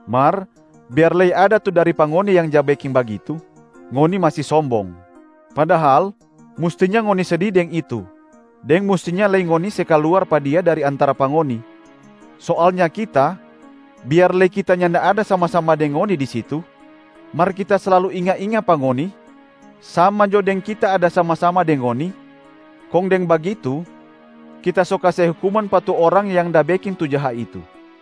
Mar biar lei ada tu dari pa ngoni yang ja beking bagitu, ngoni masi sombong. Padahal mustinya ngoni sedi deng itu, deng mustinya lei ngoni se kaluar pa dia dari antara pa ngoni. Soalnya kita, biar lei kita nyanda ada sama-sama deng ngoni di situ, mar kita slalu inga-inga pa ngoni sama jo deng kita ada sama-sama deng ngoni, kong deng bagitu kita so kase hukuman pa tu orang yang da beking tu jaha itu.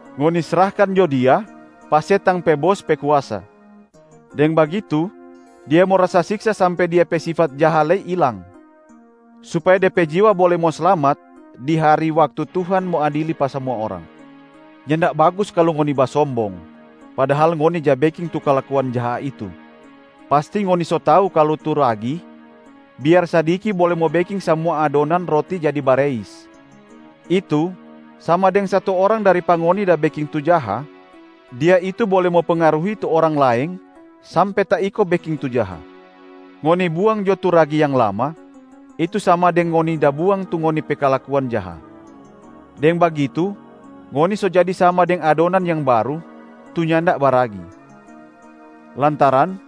ngoni srahkan jo dia pa setang pe bos pe kuasa. Deng bagitu dia mo rasa siksa sampe dia pe sifat jaha lei ilang, supaya de pe jiwa bole mo slamat di hari waktu Tuhan mo adili pa samua orang. Nyanda bagus kalu ngoni basombong, padahal ngoni ja beking tu kalakuan jaha itu. Pasti ngoni so tau kalu tu ragi biar sadiki bole mo beking samua adonan roti jadi bareis, itu sama deng satu orang dari pa ngoni da beking tu jaha, dia itu bole mo pengaruhi tu orang laeng sampe taiko beking tu jaha. Ngoni buang jo tu ragi yang lama, itu sama deng ngoni da buang tu ngoni pe kalakuan jaha. Deng bagitu ngoni so jadi sama deng adonan yang baru tu nyanda baragi, lantaran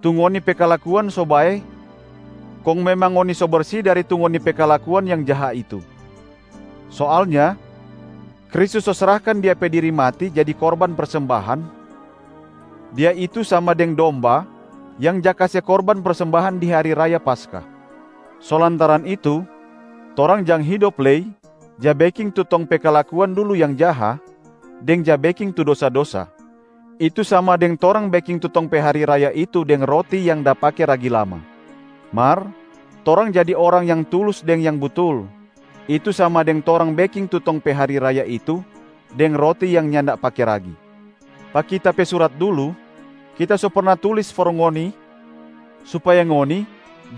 tu ngoni pe kalakuan so bae kong memang ngoni so bersi dari tu ngoni pe kalakuan yang jaha itu. Soalnya Kristus so srahkan Dia pe diri mati jadi korban persembahan, Dia itu sama deng domba yang ja kase korban persembahan di hari raya Paskah. So lantaran itu, torang jang hidop lei ja beking tu tong pe kalakuan dulu yang jaha deng ja beking tu dosa-dosa, itu sama deng torang beking tu tong pe hari raya itu deng roti yang da pake ragi lama. Mar torang jadi orang yang tulus deng yang butul, itu sama deng torang beking tu tong pe hari raya itu deng roti yang nyanda pake ragi. Pa kita pe surat dulu, kita so perna tulis for ngoni supaya ngoni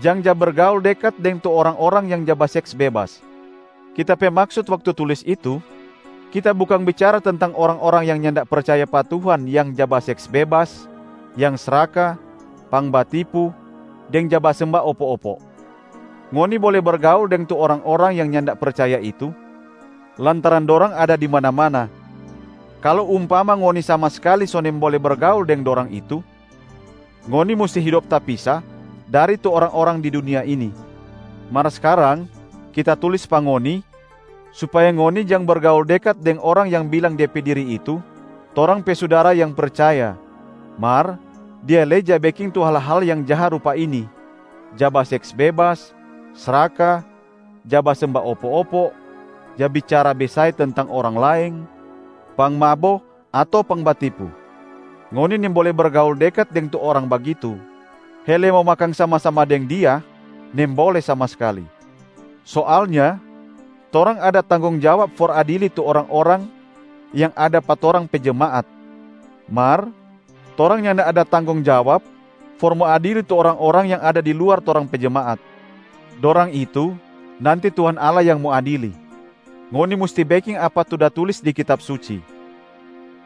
jang ja bergaul dekat deng tu orang-orang yang ja baseks bebas. Kita pe maksut waktu tulis itu, kita bukang bicara tentang orang-orang yang nyanda percaya pa Tuhan yang ja baseks bebas, yang sraka, pangbatipu, deng ja basemba opo-opo. Ngoni bole bergaul deng tu orang-orang yang nyanda percaya itu lantaran dorang ada di mana-mana. Kalu umpama ngoni sama skali so nimbole bergaul deng dorang itu, ngoni musti hidop tapisa dari tu orang-orang di dunia ini. Mar skarang kita tulis pa ngoni supaya ngoni jang bergaul dekat deng orang yang bilang de pe diri itu torang pe sudara yang percaya mar dia lei ja beking tu hal-hal yang jaha rupa ini: ja baseks bebas, sraka, ja basemba opo-opo, ja bicara besae tentang orang laeng, pangmabo ato pangbatipu. Ngoni nimbole bergaul dekat deng tu orang bagitu, hele mo makang sama-sama deng dia nimbole sama skali. Soalnya torang ada tanggong jawab for adili tu orang-orang yang ada pa torang pe jemaat, mar torang nyanda ada tanggong jawab for mo adili tu orang-orang yang ada di luar torang pe jemaat. Dorang itu nanti Tuhan Allah yang mo adili. Ngoni musti beking apa tu da tulis di Kitab Suci,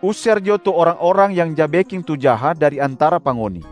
“User jo tu orang-orang yang ja beking tu jaha dari antara pa ngoni!”